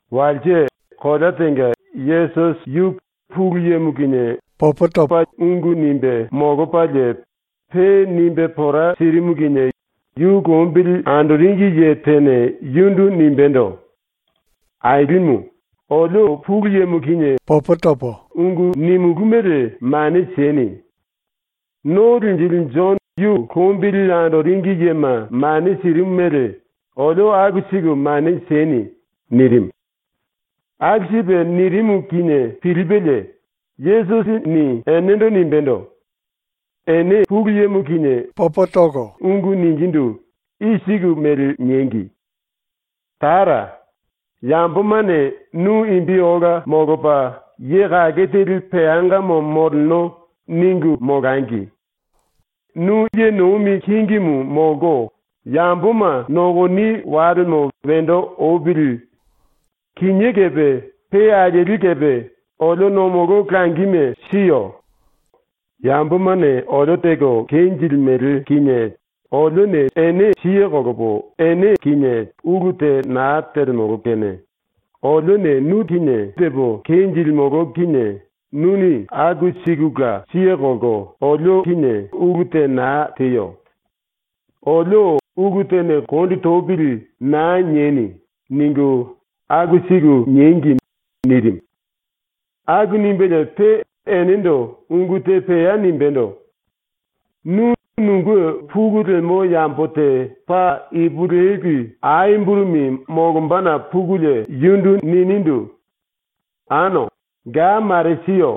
Walse, kolea tenga, Yesusi yu Pulu Yemo kinie ungu nimbe molopalie pe nimbe pora sirimu kinie yu lombili andoringi ye tene yundu nimbendo: “Ailimu, olio Pulu Yemo kinie ungu nimulú mele mane sieni. ⸤No Linjili⸥ Jono yu lombili andoringi yema mane sirimu mele olio aku siku mane sieni.” nirimu. ⸤Aku sipe nirimu kinie pilipelie⸥ Yesusini enendo nimbendo: “Ene Pulu Yemo kinie ungu ningindu i siku mele niengi: “Tara, yambomane ‘Nu imbi ola molopa, ye kake teli peangamo moleno.’ ningu molangi. Nu ye nomi kingimu molko yamboma nokoni walemo wendo opili. Kinié kepe pe alieli kepe olio nomolo langime siyo. Yambomane olio teko kenjilimele kinie siye kolopo ulu te naa telemolo kene olione nu tepo kenjilimolo kinie nuni aku sikula siye kolko olio ulu te naa teyo. Olio ‘Ulu tene kondi topili.’ naa nieni.” ningu aku siku niengi.” nirimu. Aku nimbelie pe enendo ungu te pea nimbendo: “Nu nunge pulu lemo yambo te paa ipulueli ai burumi molombana pukulie yundu ninindu: “Ano, ga mare siyo.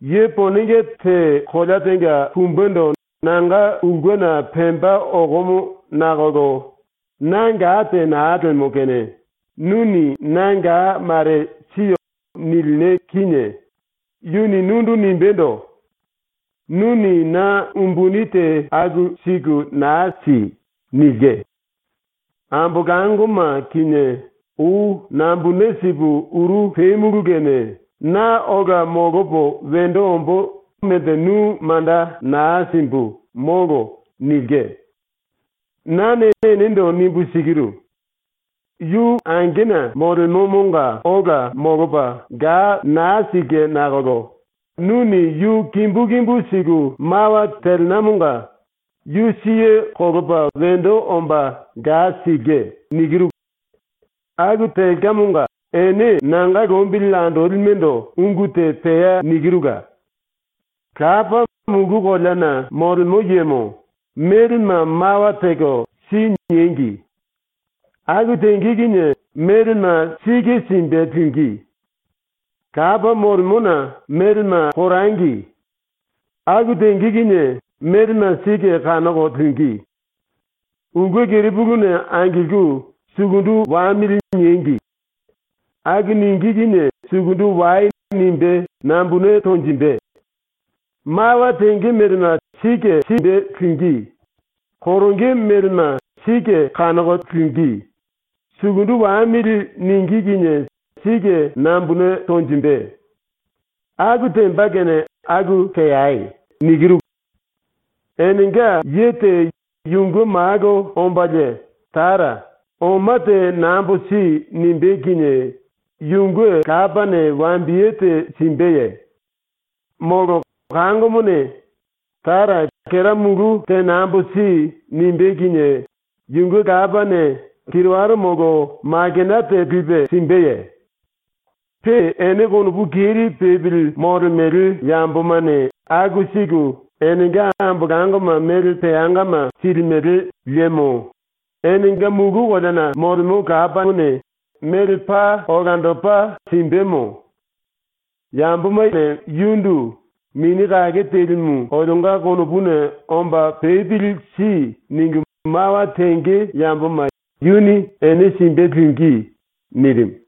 Ye ponenge te kolea tenga pumbendo nanga ulkena pemba okomo nakolo na ga te naa lemo kene nuni na ga mare si.” nilina kinie yuni nundu nimbendo: “Nuni na umbuni te aku siku naa si.” nilke. “Ambolangoma kinie ou nambune sipu uru pemulu kene na ola molopo wendo ombo melte nu manda naa simbu, molo.” nilke. “Nane enendo nimbu sikiru: Yu angena molemomonga ola molopa ga naa silke nakolo nuni yu kimbu kimbu siku mawa telinamonga yu siye kolopa wendo omba ga silke. “Aku telkamonga ene ⸤nanga lombili andolime⸥ ndo ungu te pea nikirula: ⸤Lapa, Mulu Koleana Molemo Yemo,⸥ melema mawa teko “Si.” niengi. Aku tenge kinie melema sike simbe lingí. ⸤Lapa molemona⸥ melema korangi. Aku tenge kinie melema sike kanoko lingí. Ulke kerepuluna angilku “Sukundu wamili.” niengi. Aku ningí kinie “Sukundu wai.” nimbe nambune tonjimbe. Mawa tenge melema sike simbe lingí, koronge melema sike kanoko lingí, “Sukundu wamili.” ningí kinie sike nambune tonjimbe. Aku temba kene aku teai. “Enenga ye te yunge malo ombalie “Tara, oma te nambo si.” nimbé kinie yunge lapane wambiye te simbeye? Molo kangomone “Tara, kera mulu te nambo si.” nimbé kinie yunge lapane kiriwara molo makena te lipe simbeye? Pe ene konopu keri pepili molemele yambomane aku siku enenga ambolangoma mele peangama silimele liemo, enenga mulu koleana molemo Lapamone ⸤mele paa olandopa naa simbeye? Olandopa simbemo.⸥ Yambomane yundu “Mini Kake Telimu olionga konopuna omba pepili si.” ningu mawa tenge yamboma yuni ene simbe lingí.” nirimu.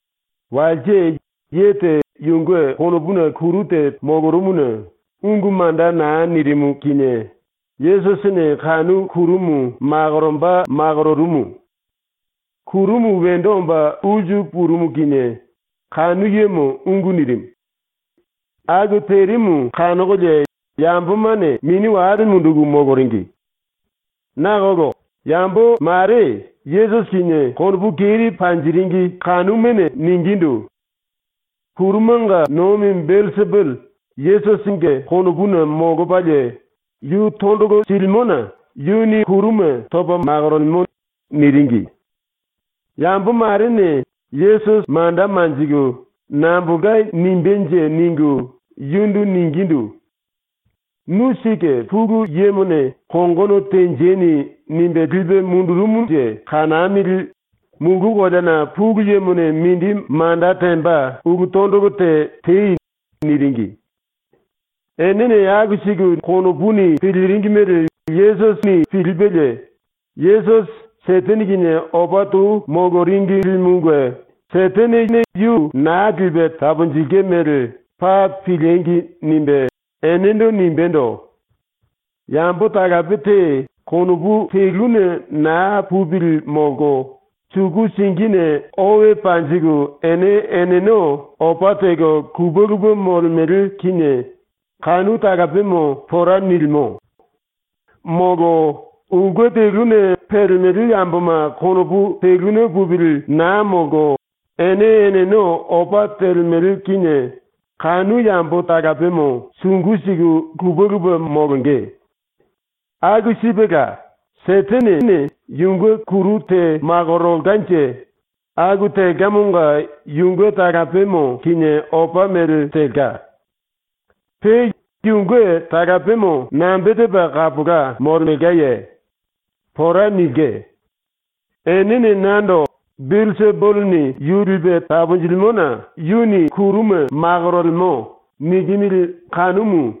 Walse ye te yunge konopuna kuru te molorumuna ungu manda naa nirimu kinie Yesusini kanu kurumu makoromba makororumu. Kurumu wendo omba ulsu purumu kinie kanu yemo ungu nirimu. Aku terimu kanokolie yambomane mini wale munduku moloringi. Nakolo yambo mare ⸤Yesusi kinie konopu keri panjiringi⸥ kanumane ningindu: “Kurumanga nomi Belsipuli Yesusinge konopuna molopalie yu tondolo silimona yuni kuruma topa makorolemo.” niringi. Yambo marene Yesusi manda manjiku “Nambolka nimbenje.” ningu yundu ningindu: “Nu sike Pulu Yemone ‘Kongono tenjeni.’ nimbe lipe mundurumunje kanamili, mulu koleana ⸤Pulu Yemone mindi manda temba⸥ ulu tondolo te tei.” niringi. Enene aku siku konopuni piliringi mele Yesusini pilipelie ‘⸤Yesusi Setene kinie opa tou moloringilimunge Setenene yu naa lipe taponjilke mele paa piliengi!’ nimbe⸥ enendo nimbendo: “Yambo talape te konopu teluna naa pupili molko suku singine owe panjiku ene eneno opa teko lupe lupe molemele kinie kanu talapemo pora nilimo. ⸤Molo⸥ ulke teluna pelemele yamboma konopu teluna pupili naa molko ene eneno opa telemele kinie kanu yambo talapemo sungu siku lupe lupe molonge. Aku sipela, Setenene yunge kuru te makorolkanje aku telkamonga yunge talapemo kinie opa mele telka. Pe yunge talapemo nambe tepa kapola molemelkaye? ⸤Pora nilke.⸥ Enene nando “Belsipulini yu lipe taponjilimona yuni kuruma makorolemo.” nikimili kanumu.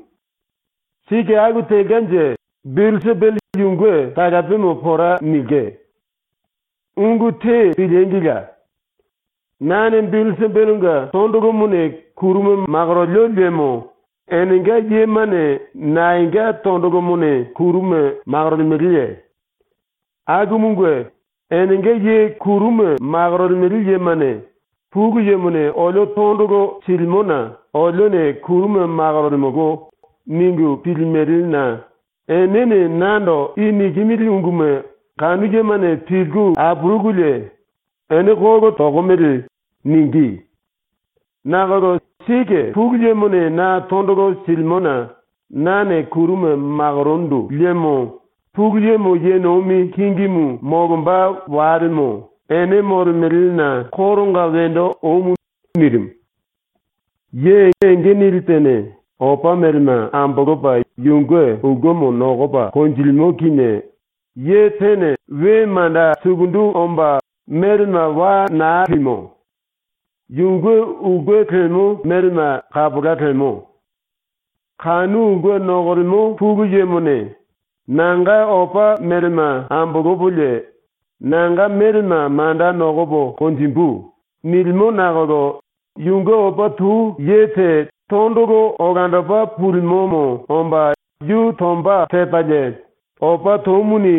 Sike aku telkanje Belsipuli yunge talapemo pora nilke. “Ungu te piliengila! Nane Belsipulinge tondolomone kuruma makorolio liemo enenga yemane naenga tondolomone kuruma makorolemeleye? Akumunge, ⸤enenga ye kuruma makorolemele yemane ‘Pulu Yemone olio tondolo silimona olione kuruma makorolemolo.’ ningu pilimelena⸥ enene nando i nikimili unguma kanu yemane pilku apurukulie “Ene kolo tokomele.” ningí. Nakolo sike Pulu Yemone na tondolo silimona nane kuruma makorondu liemo Pulu Yemo ye nomi kingimu molomba walemo ene molemelena koronga wendo omu.” ⸤nirimu.⸥ “Ye enge nili tene opa melema ambolopa yunge ulkemo nokopa konjilimo kinie ye tene we manda sukundu omba melema wa naa limo. Yunge ulke lemo melema kapola lemo. Kanu ulke nokolemo pulu yemone ‘Nanga opa melema ambolopolie nanga melema manda nokopo konjimbu.’ nilimo nakolo yunge opa tou ye te tondolo olandopa pulimomo omba yu tomba tepalie opa toumuni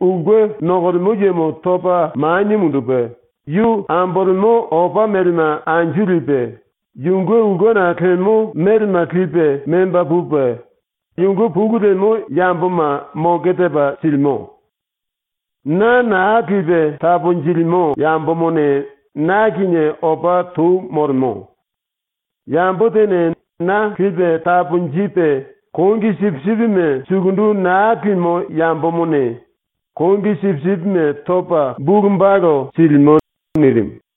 ulke nokolemo yemo topa manie mundupe yu ambolemo opa melema anju lipe, yunge ulkena lemo melema lipe memba pupe yunge pulu lemo yamboma moke tepa silimo. “Na naa lipe taponjilimo yambomone na kinie opa tou molemo. Yambo tene na lipe taponjipe ⸤kongi sipisipime⸥ sukundu naa limo yambomone ⸤kongi sipisipime⸥ topa bulu balu silimo.” ⸤nirimu.⸥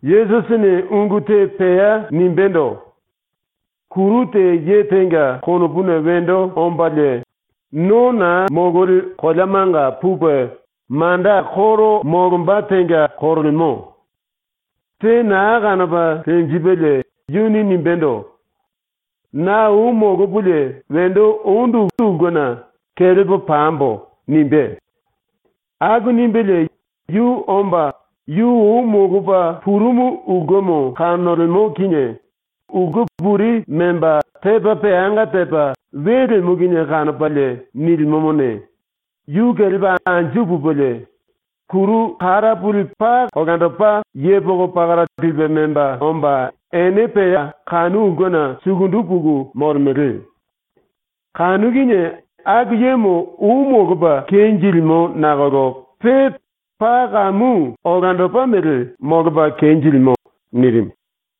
⸤Yesusini ungu te pea nimbendo:⸥ “Kuru te ye tenga konopuna wendo ombalie, no naa mololi koleamanga pupe manda koro molomba tenga korolemo. Te naa kanopa lenjipelie yuni nimbendo: ‘Na ou molopolie wendo ondu ulkena kelepo pambo.’ nimbé. Aku nimbelie yu omba yu ou molopa purumu ulkemo kanolemo kinie, ulke puri memba tepa peanga tepa we lemo kinie kanopalie nilimomone, yu kelepa anju pupelie, kuru kara puli paa olandopa yepoko pakara lipe memba omba ene pea kanu ulkena sukundu puku molemele. Kanu kinie aku yemo ou molopa kenjilimo nakolo pe paa kamu olandopa mele molopa kenjilimo.” nirimu.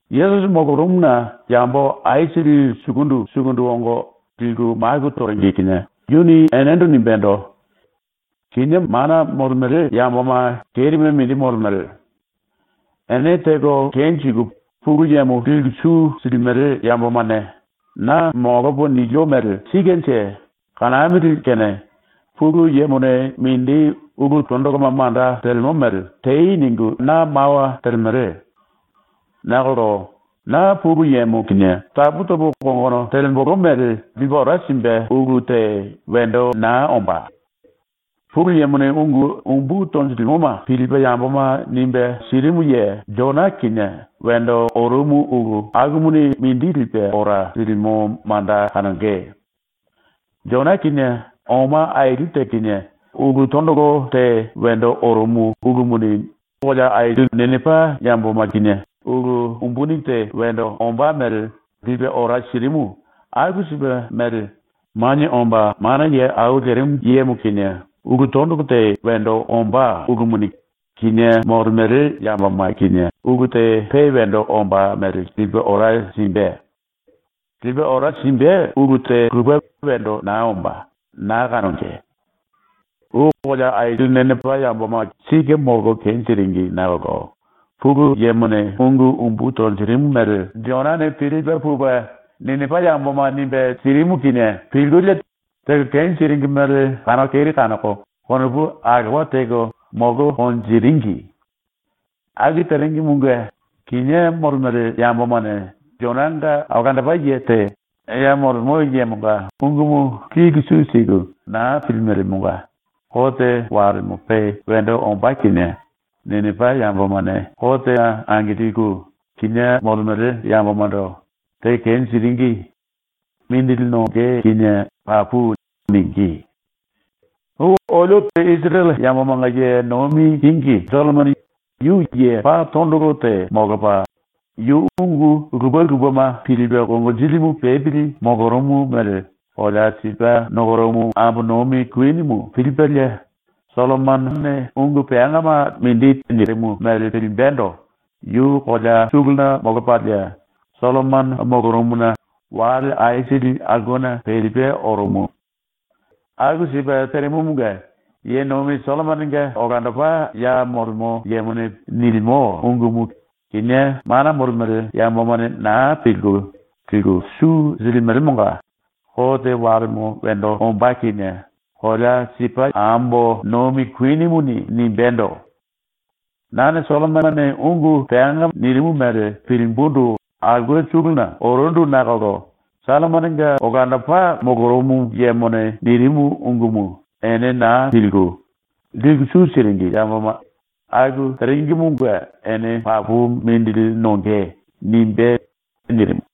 Yesusi molorumuna yambo aisili sukundu sukundu ongo liku maku toringi kinie yuni enendo nimbendo: “Kinié mana molemele yamboma kerime mindi molemele. Ene teko kenjiku Pulu Yemo liku su silimele yambomane “Na molopo nilio mele sikenje, kanamili kene Pulu Yemone mindi ulu tondoloma manda telemo mele tei.” ningu na mawa telemele. Nakolo ⸤na Pulu Yemo kinie tapu topo kongono telembolo mele lipe ora simbe ulu⸥ te wendo naa ombá. ⸤Pulu Yemone ungu umbu tonjirimuma pilipe yamboma nimbe sirimu ye⸥ Jona kinie wendo orumu ulu akumuni mindi lipe ora silimo manda kanonge. Jona kinie ⸤oma aili te kinie⸥ ulu tondolo te wendo orumu ulumuni Ninipa yamboma ⸤kinie ulu umbuni te wendo ombá mele⸥ lipe ora sirimu aku sipe mele Manie Omba Mana Ye Au Lerimu Yemo kinie ulu tondolo te wendo ombá ulumuni kinié molemele yamboma kinie ulu te pe wendo ombá mele lipe ora simbe. ⸤Lipe ora simbe ulu te lupe wendo naa ombá, naa kanonge.⸥ “Ou kolea aili Ninipa yamboma ⸤sike molko kenjiringi nakolo Pulu Yemone ungu umbu tonjirimu mele⸥ Jonane ⸤pilipe⸥ pupe Ninipa yamboma nimbe sirimu kinie pilkulie teko kenjiringi mele kanoko keri kanoko konopu alowa teko molko konjiringi. Aku teringimunge kinié molemele yambomane Jonanga olandopa ye te ya molemo yemonga ungumu liku su siku naa pilimelemonga kote walemo pe wendo ombá kinie Ninipa yambomane kotena angilku, kinié molemele yambomando “Teko kenjiringi. Mindili nonge kinie papu.” ningí. “Ou ⸤olio Isirele yambomanga ye nomi kingi⸥ Sollomono yu ye paa tondolo te molopa, yu ungu lupe lupema pilipe konginjilimu pepili molorumu mele kolea Sipa nokorumu ambo nomi kuinimu pilipelie, Sollomonone ungu peangama mindi nirimu mele pilimbendo yu kolea suluna molopalie ⸤Sollomono molorumuna⸥ wale aisili aulkena pelipe orumu. Aku sipe terimumunge, ye nomi Sollomononga olandopa ya molemo yemone nilimo ungumu kinié mana molemele yambomane naa pilku, liku su silimelemonga kote walemo wendo ombá kinie kolea Sipa ambo nomi kuinimuni nimbendo: “Nane Sollomonone ungu peanga nirimu mele pilimbundu aulke suluna orundu nakolo Sollomononga olandopa molorumu yemone nirimu ungumu ene naa pilku, liku su siringi yamboma aku teringimunge ene papu mindili nonge.” nimbé.” ⸤nirimu.⸥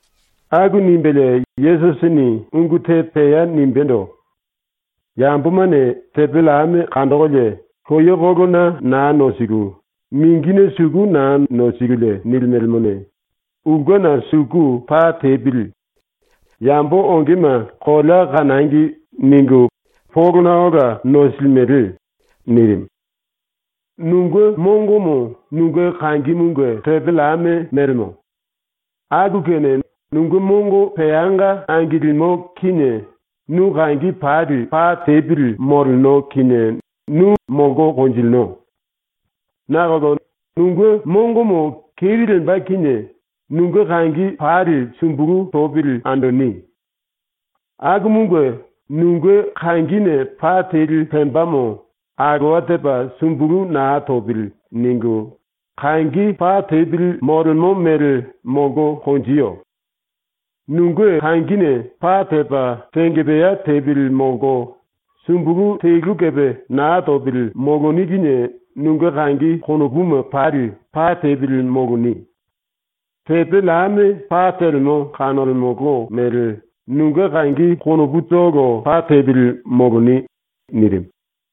⸤Aku nimbelie Yesusini ungu te pea nimbendo:⸥ “Yambomane tepe llame kandokolie loyekolona naa nosiku, mingine suku naa nosikulie nilimelemone, ‘Ulkena suku pa tepili. Yambo ongema kolea kanangi.’ ningu polona ola nosilimele.” ⸤nirimu.⸥ “Nunge mongomo nunge kangimunge tepe llame mélemo. Aku kene nunge mongo peanga angilimo kinie nu kangi pali pa tepili moleno kinie nu molko konjilino. Nakolo nunge mongomo keri lemba kinie nunge kangi pali sumbulu topili andoni. Akumunge, nunge kangine pa teli pembamo ‘alowa tepa sumbulu naa topili.’ ningu ⸤kangi pa tepili molemo mele molko konjiyo⸥. Nunge kangine pa tepa tengepea tepili molko sumbulu telu kepe naa topili moloni kinie nunge kangi konopuma pali pa tepili moloni. Tepe llame pa telemo kanolemolo mele nunge kangi konoputolo pa tepili moloni.” nirimu.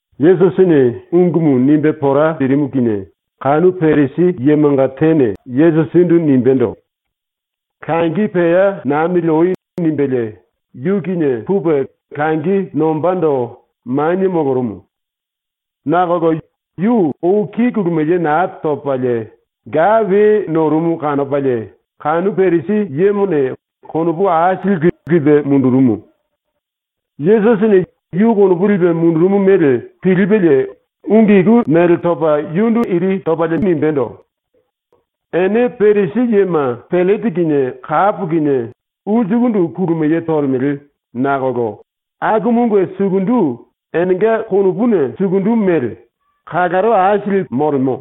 Yesusini ungumu nimbe pora sirimu kinie kanu Parisi yemanga tene Yesusindu nimbendo: “Langi pea nambili oi.” nimbelie yu kinie pupe langi nombando manie molorumu. Nakolo yu ou ki kulumiye naa topalie ga we norumu kanopalie kanu Parisi yemone konopu aisili lipe mundurumu. Yesusini ⸤yu konopu lipe mundurumu mele⸥ pilipelie ⸤ungu iku mele topa⸥ yundu nimbendo: “Ene Parisi yema pellete kinie kapo kinie ulsukundu kulumiye tolemele nakolo akumunge sukundu, enenga konopuna sukundu mele, kalaro aisili molemo.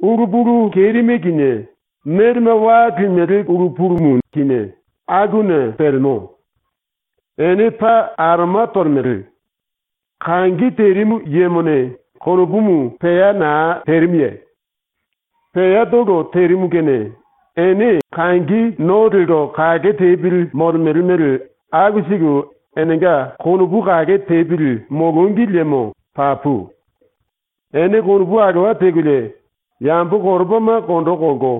Ulu pulu kerime kinie, melema wa limele ulu pulumu kinie akuna pelemo. Ene paa aroma tolemele. Kangi terimu yemone konopumu pea naa terimuye? ⸤Peatolo terimu kene⸥ ene kangi no lelko kake tepili molemele mele aku siku enenga konopu kake tepili molongi liemo papu. Ene konopu alowa tekolie yambo koropama kondo kolko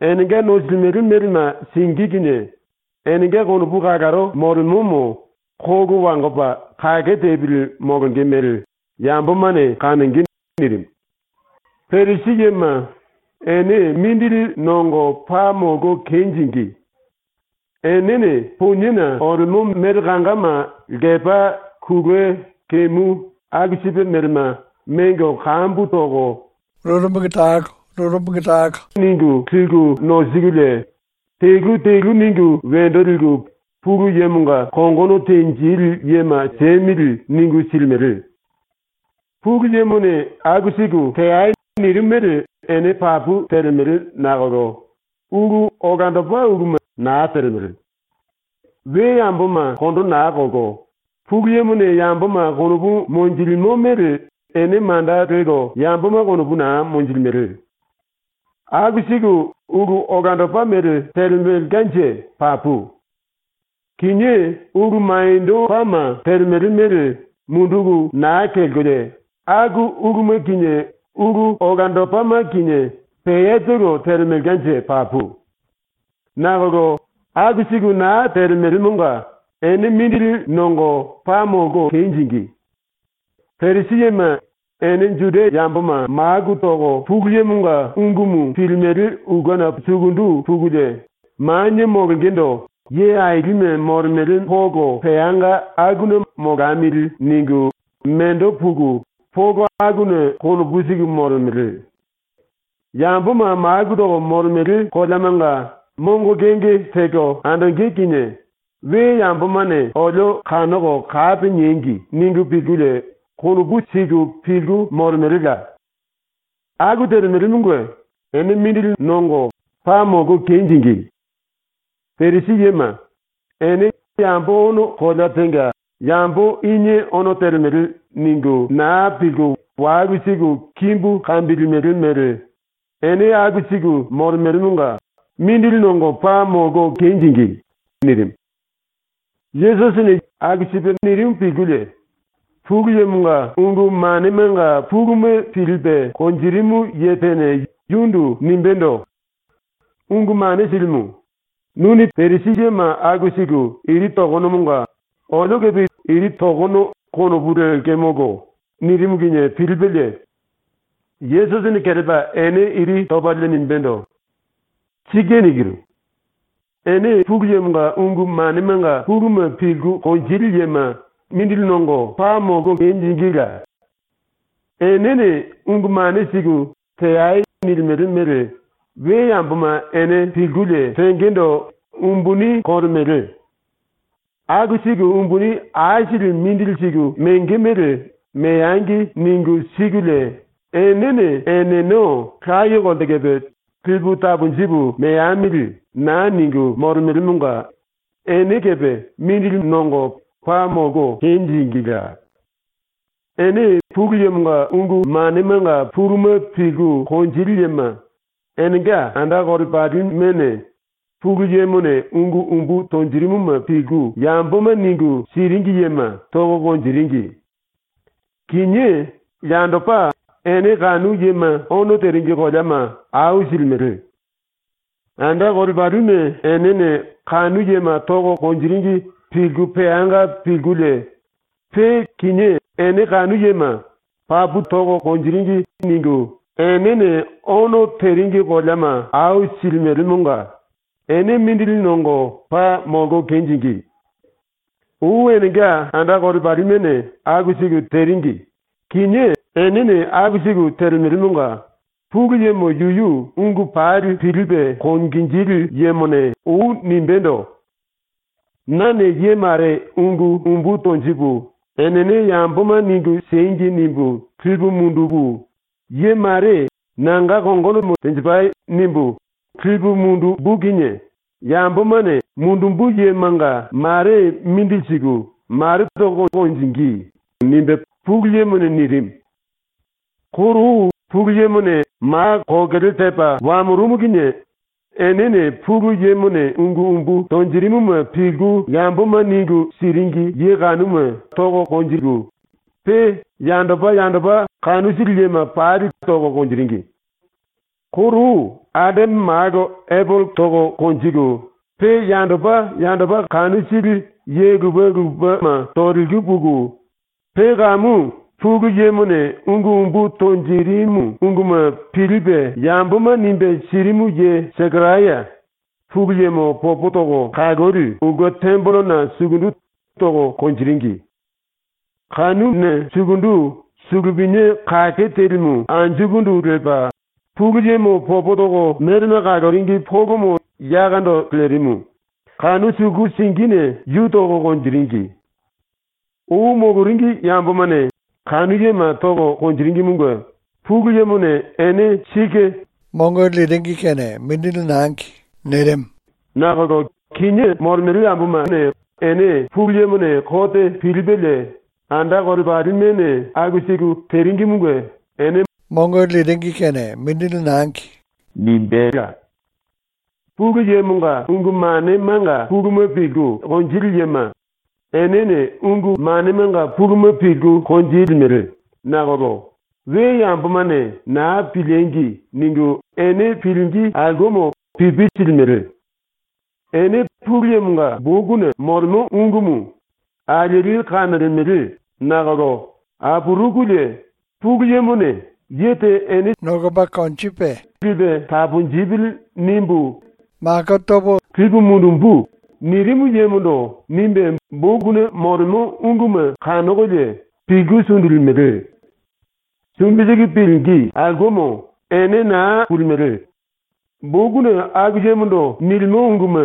enenga nosilimele melema singí kinie enenga konopu kalaro molemomo kolo wangopa kake tepili molonge mele yambomane kanonge.” ⸤nirimu.⸥ “Parisi yema, ene mindili nongo paa molko kenjingí! Enene poniena olemo mele kangama lkepa kulue kemu aku sipe melema mengo kambu toko tene tene ningu liku nosikulie telu telu ningu wendo liku ‘Pulu Yemonga kongono tenjili yema siemili.’ ningu silimele. Pulu Yemone aku siku ‘Teai.’ nirimu mele ene papu telemele nakolo ulu olandopa uluma naa telemele. We yamboma kondo naa kolko, Pulu Yemone yamboma konopu monjilimo mele ene manda lelko yamboma konopu naa monjilimele. Aku siku ulu olandopa mele telemelkanje papu. Kinié ulu maniendopama telemele mele munduku naa kelkolie aku uluma kinie ulu olandopama kinie peatolo telemelkanje papu. Nakolo aku siku naa telemelemonga ene mindili nongo paa molko kenjingí! “Parisi yema, ene Juda yamboma maku toko Pulu Yemonga ungumu pilimele ulkena sukundu pukulie manie molongendo ye ailime molemele polo peanga akuna ‘molamili.’ ningu mendo puku polo akuna konopu siku molemele. Yamboma maku toko molemele koleamanga mongo kenge teko andonge kinie ‘We yambomane olio kanoko kapi niengi.’ ningu pilkulie konopu siku pilku molemelela. Aku telemelemonga ene mindili nongo paa molko kenjingí! “⸤Parisi yema,⸥ ene yambo ono kolea tenga ‘Yambo inie ono telemele.’ ningu naa pilku walu siku kimbu kambilimele mele ene aku siku molemelemonga mindili nongo paa molko kenjingí!” nirimu. Yesusini aku sipe nirimu pilkulie Pulu Yemonga ungu manemanga puluma pilipe konjirimu ye tene yundu nimbendo: “Ungu Mane Silimu, ‘Nuni Parisi yema aku siku iri tokonomonga olio kepe iri tokono.’ konopu lekemolo.” nirimu kinie pilipelie Yesusini kelepa ene ⸤iri topalie⸥ nimbendo: “Sike nikinu. Ene Pulu Yemonga ungu manemanga puluma pilku konjili yema mindili nongo paa molko kenjingíla! Enene ungu mane siku ‘Teai.’ nilimele mele we yamboma ene pilkulie tengendo umbuni kolemele. Aku siku umbuni aisili mindili siku menge mele ‘Meangi.’ ningu sikulie enene eneno laye kolte kepe ‘Lipu taponjipu meamili.’ naa ningu molemelemonga ene ⸤kepe⸥ mindili nongo paa molko kenjingíla! “⸤Ene Pulu Yemonga ungu manemanga puluma pilku konjili yema,⸥ enenga anda kolepalimene Pulu Yemone ungu umbu tonjirimuma pilku yamboma ningu siringi yema toko konjiringi. Kinié, yandopa, ene kanu yema ono teringi koleama au silimele. Anda kolepalime enene kanu yema toko konjiringi pilku peanga pilkulie pe kinié ene kanu yema ‘Papu toringi.’ ningu enene ono teringi koleama au silimelemonga ene mindili nongo paa molko kenjingí! “⸤Ou enenga anda kolepalimene aku siku teringi, kinié enene aku siku telemele⸥ monga Pulu Yemo yuyu ungu pali pilipe konginjili yemone ou nimbendo: “Nane ye mare ungu umbu tonjipu ‘Enene yamboma ningu siengi.’ nimbu lipu mundupu, ye mare ‘Nanga kongonomo tenjipai.’ nimbu lipu mundumbu kinie yambomane mundumbu yemanga mare mindili siku, mare toko konjingí.” Pulu Yemone nirimu. “Koro ou Pulu Yemone ma kokele tepa wamorumu kinie enene Pulu Yemone ungu umbu tonjirimuma pilku yamboma ningu siringi ye kanuma toko, pe yandopa yandopa kanu sili yema pali toko konjiringi. Koro ou Adame malo Epele toko konjiku, pe yandopa yandopa kanu sili ye lupe lupema toliku puku, pe kamu Pulu Yemone ungu umbu tonjirimu unguma pilipe yamboma nimbe sirimu ye Sekaraya Pulu Yemo ⸤popo toko kaloli⸥ ulke tembelena sukundu toko konjiringi. Kanuna sukundu suluminia kake telimu anjukundu lepa, Pulu Yemo popo toko melema kaloringi polomo yakondo lerimu, kanu suku singine yu toko konjiringi. Ou moloringi yambomane kanu yema toko konjiringimunge Pulu Yemone ene sike mongo sirimu nakolo kinié molemele yambomane ene Pulu Yemone kote pilipelie anda kolepalimene aku siku teringimunge ene mongo simbela. “Pulu Yemonga ungu manemanga puluma pilku konjili yema, enene ungu manemanga puluma pilku konjilimele nakolo “We yambomane naa piliengi!” ningu ene pilingí aulkemo pipi silimele. Ene Pulu Yemonga bokuna molemo ungumu alieli kanolemele nakolo apurukulie Pulu Yemone “‘Ye te ene lipe taponjipili.’ nimbu lipu mundumbu.” nirimu yemondo nimbe bokuna molemo unguma kanokolie pilku sundulimele. Sumbi siku pilingí aulkemo ene naa pulimele; bokuna aku yemondo nilimo unguma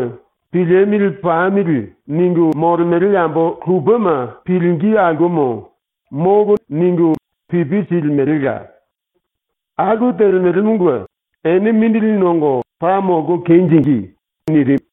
‘Piliemili pamili.’ ningu molemele yambo lupema pilingí aulkemo “Molo.” ningu pipi silimelela. Aku telemelemonga ene mindili nongo paa molko kenjingí!” nirimu.